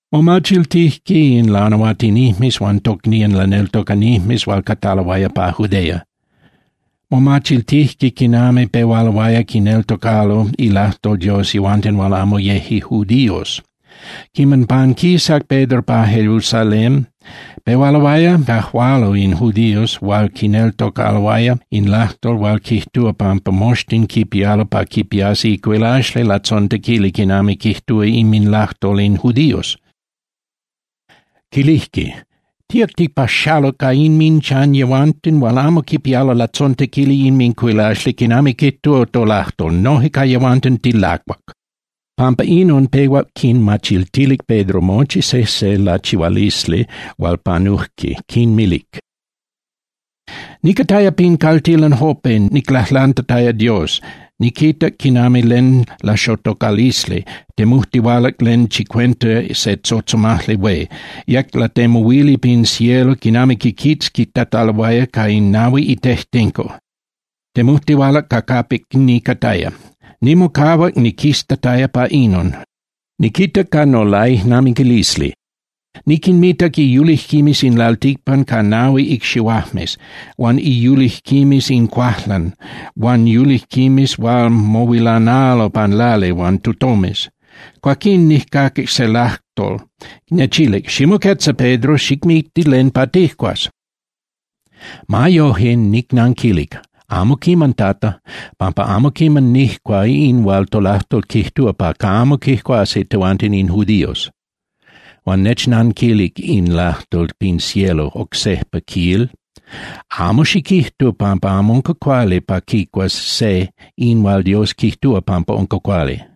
Momachiltijque in lanahuatinijmes huan tocnían laneltocanijmes hual cataloaya pa Judea, momachiltijque quinami pehualoaya quineltocalo ilajtol Dios yehuanten hual amo yeje judíos. Quiman panquisac Pedro pa Jerusalén, pehualoaya cajualo in judíos hual quineltocaloaya in lajtol hual quijtúa pampa moxtin quipialo pa quipiasqui icuilaxli latzontequili quinami quijtúa inminlajtol in judíos. Quilijque: —Tíac tipaxaluc pa inminchan yehuanten hual amo quipialo latzontequili inmincuilaxli quinami quijtúa tolajtol, noje ca yehuanten tilacuac. Pampa inon, pehuac quinmachiltilic Pedro mochi sejse lachihualisli hual panujque, quinmilic: —Nicataya pin caltilan Jope, niclajlantataya Dios. Niquitac quinami len laxotocalisli, temujtihualac len chicuenta se tzotzomajli hué, yec latemuhuili pin cielo quinami quiquitzquitataloaya ca in nahui itejtenco, temujtihualac ca capic nicataya. Nimocahuac niquiztataya pa inon, niquitac ca nolaijnamiquilisli. Niquinmitac iyulijquimes in lalticpan ca nahui icxihuajmes, huan iyulijquimes in cuajlan huan yulijquimes hual mohuilanalo pan lali huan tutomes. Cuaquín nijcaquic se lajtol, nechilic: “Ximoquetza, Pedro, xicmicti len pa tijcuas.” Ma yoje, nicnanquilic: “Amo quiman, Tata, pampa amo quiman nijcua in hual tolajtol quijtúa pa camo quicuasi tehuanten in judíos.” Huan nechnanquilic in lajtol pin cielo oc sejpa, quil: “Amo xiquijtu pampa amo unca cuali pa quicuas se in hual Dios quijtúa pampa unca cuali.”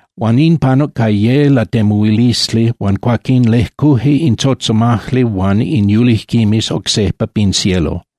Huan in panuc ca ye latemuhuilisli huan cuaquín lejcuje in tzotzomajli huan in yulijquimes oc sejpa pin cielo.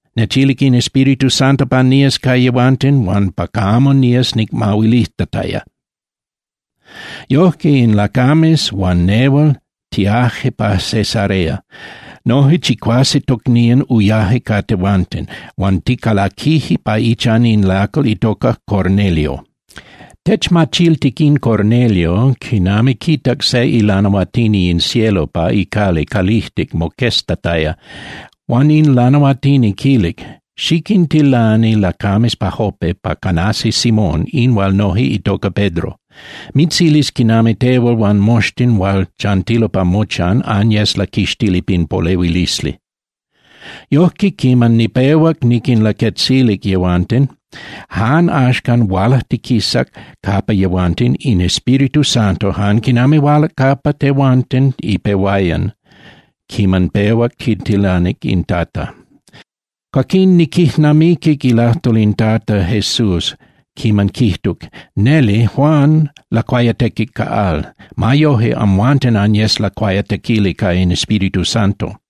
Nechilic in Espíritu Santo pa nías ca yehuanten huan pa camo nías nicmahuilijtataya. Yojque in lacames huan nehual tiaje pa Cesarea, noje chicuase tocnían uyaje ca tehuanten huan ticalaquije pa ichan in lacal itoca Cornelio. Techmachiltic in Cornelio quinami quitac se ilanahuatini in cielo pa icali calijtic moqueztataya, huan in lanahuatini quilic: “Xiquintilani lacames pa Jope pa canasi Simón, in hual noje itoca Pedro. Mitzilis quinami tehual huan moxtin hual chantilo pa mochan anyes laquixtili pin polehuilisli.” Yojque, quiman nipehuac niquinlaquetzilic yehuanten, jan axcan hualajtiquisac capa yehuanten in Espíritu Santo jan quinami hualac capa tehuanten ipehuayan quiman pehuac quitilanic in Tata. Cuaquín niquijnamiquic ilajtol in Tata Jesús quiman quijtuc: “Neli Juan lacuayatequic ca al. Ma yoje, amhuanten anyes lacuayatequili ca in Espíritu Santo.”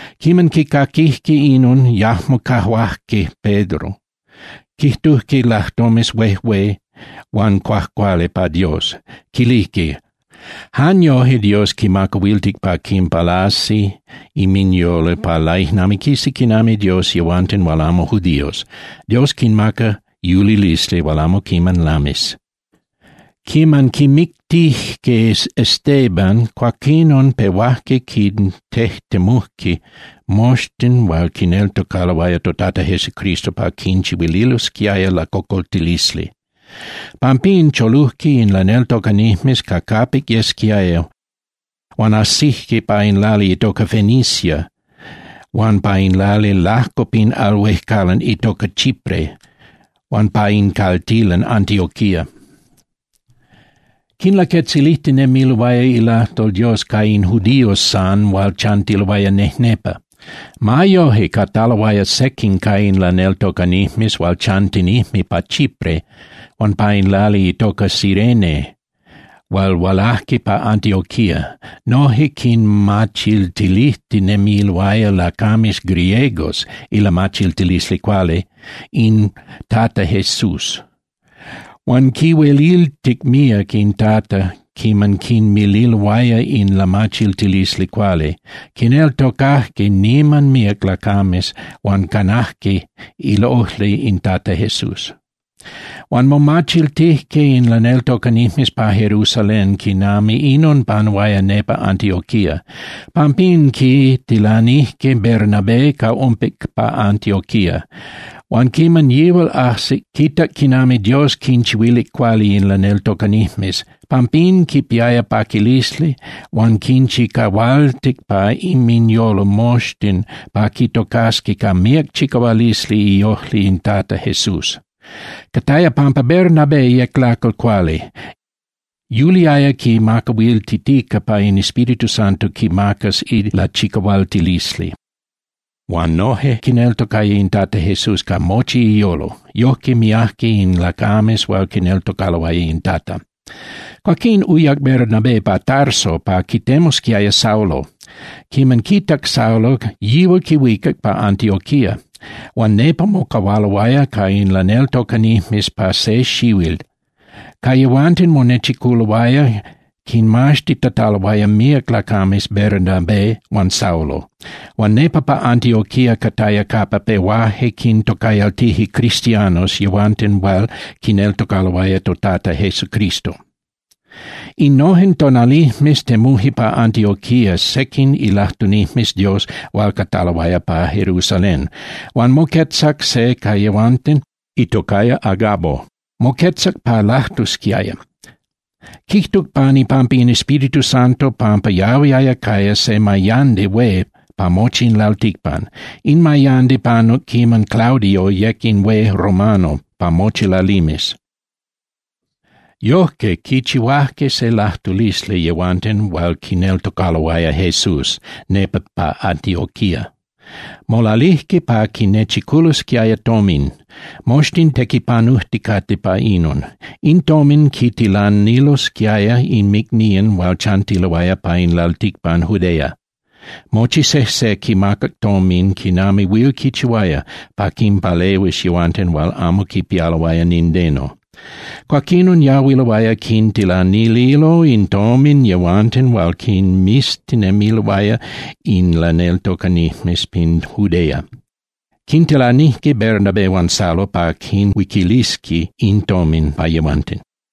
Quiman quicaquijque inon, yajmo cajuajque Pedro, quijtujque lajtomes huejué huan cuajcuali pa Dios, quilijque: —¡Jan yoje Dios quimacahuiltic pa quinpalasi inminyolo pa laijnamiquisi quinami Dios yehuanten hual amo judíos, Dios quinmaca yulilisli hual amo quiman lamis! Quiman quimictijque Esteban, cuaquinon pehuajque quintejtemujque moxtin hual quineltocaloaya toTata Jesucristo pa quinchihuililosquiaya lacocoltilisli. Pampín cholujque in laneltocanijmes ca capic yesquiaya huan ajsijque pa in lali itoca Fenicia huan pa in lali lajco pin al huejcalan itoca Chipre huan pa in caltilan Antioquía. Quinlaquetzilijtinemiloaya ilajtol Dios ca in judíos san hual chantiloaya nejnepa. Ma yoje, cataloaya sequin ca in laneltocanijmes hual chantinijme pa Chipre huan pa in lali itoca Cirene hual hualajque pa Antioquía, noje quinmachiltilijtinemiloaya lacames griegos ilamachiltilisli cuali in Tata Jesús. Huan quinhueliltic míac in Tata quiman quinmililoaya in lamachiltilisli cuali. Quineltocajque niman míac lacames huan canajque iojli in Tata Jesús. Huan momachiltijque in laneltocanijmes pa Jerusalén quinami inon panuaya nepa Antioquía. Pampín quitilanijque Bernabé ca umpic pa Antioquía. Huan quiman yihual ajsic, quitac quinami Dios quinchihuilic cuali in laneltocanijmes. Pampín quipiaya paquilisli huan quinchicahualtic pa inminyolo moxtin pa quitocasqui ca míac chicahualisli iojli in Tata Jesús. Cataya pampa Bernabé yec lacal cuali. Yuliaya quimacahuiltitica pa in Espíritu Santo quimacas ilachicahualtilisli, huan noje quineltocaya in Tata Jesús ca mochi iyolo. Yojque miajque in lacames hual quineltocaloaya in Tata. Cuaquín uyac Bernabé pa Tarso pa quitemusquiaya Saulo. Quiman quitac Saulo, yihual quihuicac pa Antioquía, huan nepa mocahualoaya ca in laneltocanijmes pa se xihuil. Ca yehuanten monechiculoaya, quinmaxtitataloaya míac lacames Bernabé huan Saulo. Huan nepa pa Antioquía cataya capa pehuaje quintocayaltije cristianos yehuanten hual quineltocaloaya toTata Jesucristo. Innojen tonalijmes temuje pa Antioquía sequin ilajtunijmes Dios hual cataloaya pa Jerusalén. Huan moquetzac se ca yehuanten itocaya Agabo, moquetzac pa lajtusquiaya. Quijtuc pan ipampa in Espíritu Santo pampa yahuiaya caya se mayandi hué pa mochi in lalticpan. In mayandi panuc quiman Claudio yec in hué romano pa mochi lalimes. Yojque, quichihuajque se lajtulisli yehuanten hual quineltocaloaya Jesús nepa pa Antioquía. Molalijque pa quinechiculosquiaya tomin, moxtin tequipanujticate pa inon. In tomin quintilanilosquiaya inmicnían hual chantiloaya pa in lalticpan Judea. Mochi sejse quimacac tomin quinami huil quichihuaya pa quinpalehuis yehuanten hual amo quipialoaya nindeno. Cuaquinon yahuiloaya quintilanililo in tomin yehuanten hual quinmiztinemiloaya in laneltocanijmes pin Judea. Quintilanijque Bernabé huan Saulo pa quinhuiquilisqui in tomin pa yehuanten.